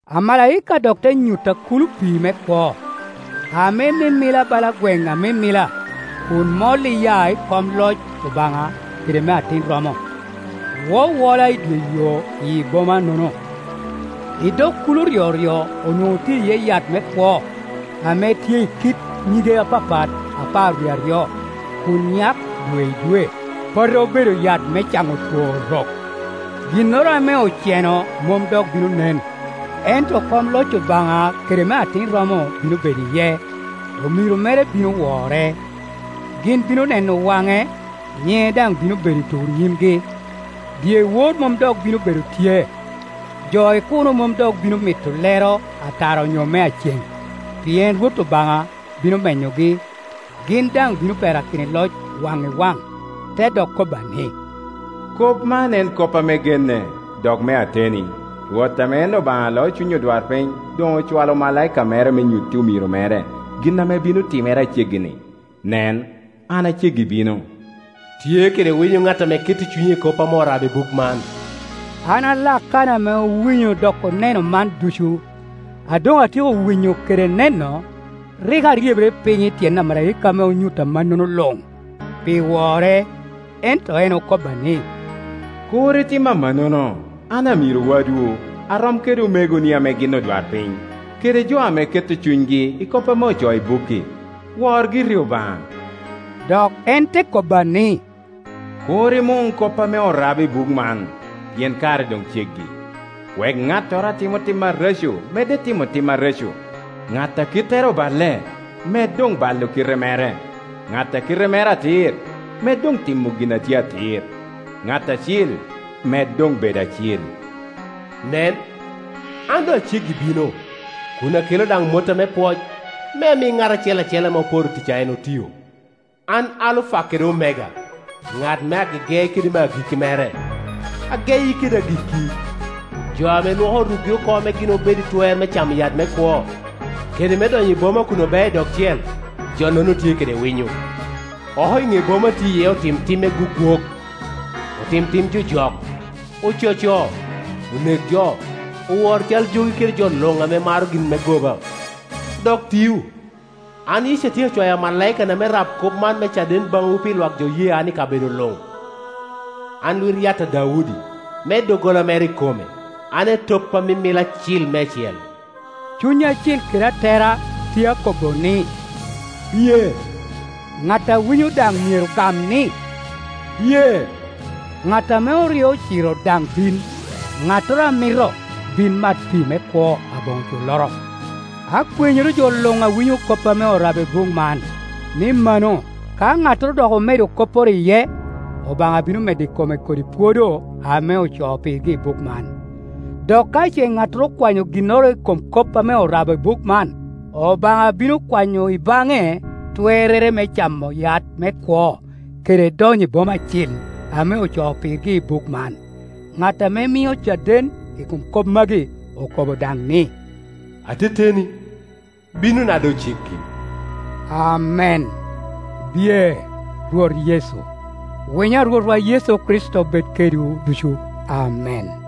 Amalaika dok te nyutta kulo pii me kwo, ame mimila bala gweŋ a mimila, kun mol iya i kom loc Obaŋa kede me Atin romo, wowola i dye yo iyi bomanono. I dog kulo ryoryo onwoŋo tye iye yat me kwo, ame tye i kit nyige apapat apar wie aryo, kun nyak dwe i dwe. Po te obedo yat me caŋo two orok. Ginnoro ame oceno mom dok bino nen, ento kom loc Obaŋa kede me Atin romo bino bedo iye; omiro mere bino wore. Gin bino neno wane, nyiŋe daŋ bino be do i tur nyimgi. Dyewor mom dok bino bedo tye, jo i kuno mom dok bino mito lero a tara onyo mea cen, pien Rwot Obaŋa bino menyogi, gin daŋ bino perakino i loc waŋ i waŋ. Te dok kobba ni, “Kop man en kop ame genne, dok me ateni, Rwot ame en Obaŋa ame loo cuny odwarpiny doŋ ocwalo amalaika mere me nyutti omiro mere gin ame bino timere a ceggi-ni. Nen, an a ceggi bino.” Tye kede winyo ŋat ame keto cunye i kop ame orabo i buk man. An a Lakana ame owinyo dok oneno man ducu. A doŋ atyeko winyo kede neno, rik aryebere piny i tyen amalaika ame onyutta mannono luŋ, pi wore; ento en okobba ni, “Kur itim amannono! An amiro wadwu, arom kede omegoni ame gin odwarpiny, kede jo ame keto cunygi i kop ame ocoo i bukki. Wor giri Obaŋa.” Dok en te kobba ni, “Kur imun kop ame orabo i buk man, pien kare doŋ ceggi. Wek ŋattoro a timo tim areco medde timo tim areco, ŋat a kittere oballe med doŋ balo kite mere, ŋat a kite mere atir med doŋ timo gin a tye atir, ŋat acil med doŋ bedo acil.” “Nen, an doŋ a ceggi bino, kun aketa daŋ motta me pwoc, me ami ŋat acel acel ame oporo tic a en otio. An Alufa kede Omega, ŋat me agege kede me agikki mere, ageyi kede agikki.” Jo ame lwoko rukgi oko me gin obed i twer me camo yat me kwo, kede me donyo i boma kun obeo i dog cel, jo-nono tye kede winyo. Oko i ne boma tye iye otim tim gwogwok, otim tim jojok, ococo, onek jo, owor cal jogi kede jo luŋ ame maro gin me goba, dok tio. “An Yecu atyeko cwayo amalaikana me rab kop man me caden baŋwu pi lwak jo oye an i kabedo luŋ. An Lwit-yat a Daudi, me doggola mere ikome, an Etop a mimila acil meicel.” Cuny Acil kede Atera tye akobbo ni, “Biye!” Ŋat a winyo daŋ myero gam ni, “Biye!” Ŋat ame oryo ociro daŋ bin, ŋattoro a mito, bin mat pii me kwo aboŋo culloro. Akwenyoro jo luŋ a winyo kop ame orabo i buk man, ni mano, ka ŋattoro dok omedo kopporo iye, Obaŋa bino medo i kome kodi pwodo ame ocoo pirgi i buk man. Dok ka ce ŋattoro okwanyo ginnoro i kom kop ame orabo i buk man, Obaŋa bino kwanyo i baŋe twerrere me nywako camo yat me kwo, kede donyo i boma acil, ame ocoo pirgi i buk man. Ŋat ame mio caden i kom kop magi, okobo daŋ ni, “Ateteni, binona doŋ ceggi.” Amen. Biye, Rwot Yecu! Winyo a Rwotwa Yecu Kricito bed kedwu ducu. Amen.